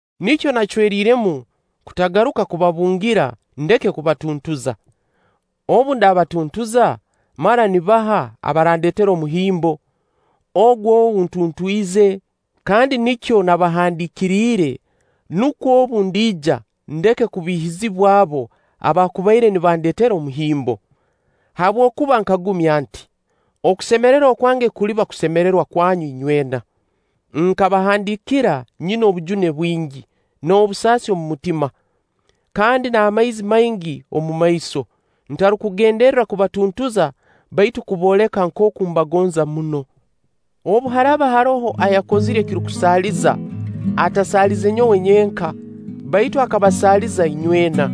Nikyo nacweriiremu kutagaruka kubabungira ndeke kubatuntuza. obu ndabatuntuza, mara nibaha abarandeetera omuhimbo? Ogu ou ntuntwize? Kandi nikyo nabahandiikiriire, nukwo obu ndiija, ndeke kubiihizibwa abo abaakubaire nibandeetera omuhimbo. Habwokuba nkagumya nti: okusemererwa kwange kuliba kusemererwa kwanyu inywena. Nkabahandiikira nyina obujune bwingi n'obusaasi omu mutima, kandi n'amaizi maingi omu maiso, ntarukugenderra kubatuntuza, baitu okubooleka nkooku mbagonza muno. Obu haraaba haroho ayakozire ekirukusaaliza, atasaalize nyowe nyenka, baitu akabasaaliza inywena.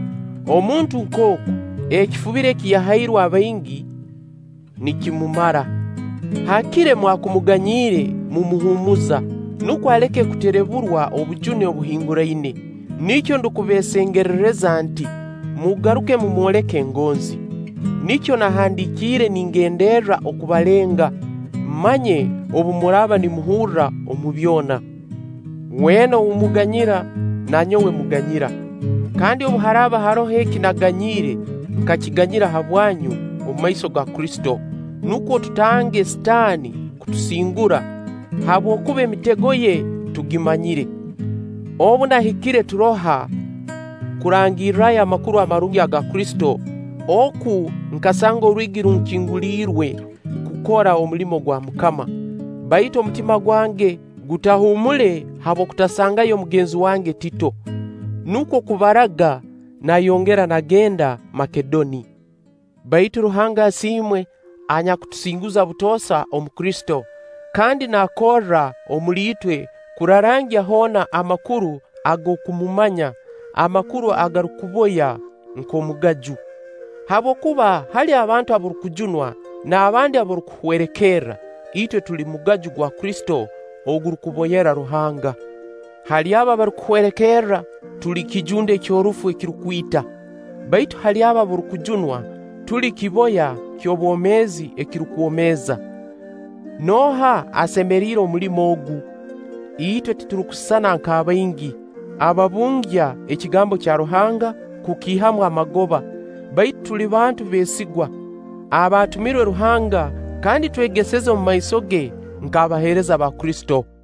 Omuntu nk'ogu, ekifubiro eki yahairwe abaingi, nikimumara. Haakire mwakumuganyiire mumuhuumuza, nukwo aleke kutereburwa obujune obuhinguraine. Nikyo ndukubeesengerereza nti: Mugaruke mumwoleka engonzi. Nikyo nahandiikiire ningenderra okubalenga, mmanye obu muraaba nimuhurra omu byona. Weena ou muganyira, na nyowe mmuganyira. Kandi obu haraaba haroho eki naaganyiire, nkakiganyira habwanyu, omumaiso ga Kristo, nukwo tutange Sitaani kutusingura; habwokuba emitego ye tugimanyire. Obu nahikire Turoha kurangirrayo Amakuru Amarungi ga Kristo, oku nkasanga orwigi runkinguliirwe kukora omulimo gwa MUKAMA. Baitu omutima gwange gutahuumule habw'okutasangayo mugenzi wange Tito. Nukwo kubaraga, nayongera nagenda Makedoni. Baitu Ruhanga asiimwe, anyakutusinguza butoosa omu Kristo, kandi naakorra omuli itwe kurarangya hoona amakuru ag'okumumanya, amakuru agarukuboya nk'omugaju. Habwokuba hali abantu abarukujunwa n'abandi abarukuhwerekerra, itwe tuli mugaju gwa Kristo ogurukuboyera Ruhanga. Hali abo abarukuhwerekerra, tuli kijunde ky'orufu ekirukwita; baitu hali abo abarukujunwa, tuli kiboya ky'obwomeezi ekirukwomeeza. Nooha asemeriire omulimo ogu? Itwe titurukusisana nk'abaingi, ababungya ekigambo kya Ruhanga kukiihamu amagoba; baitu tuli bantu beesigwa, abaatumirwe Ruhanga, kandi twegeseza omumaiso ge nk'abaheereza ba Kristo.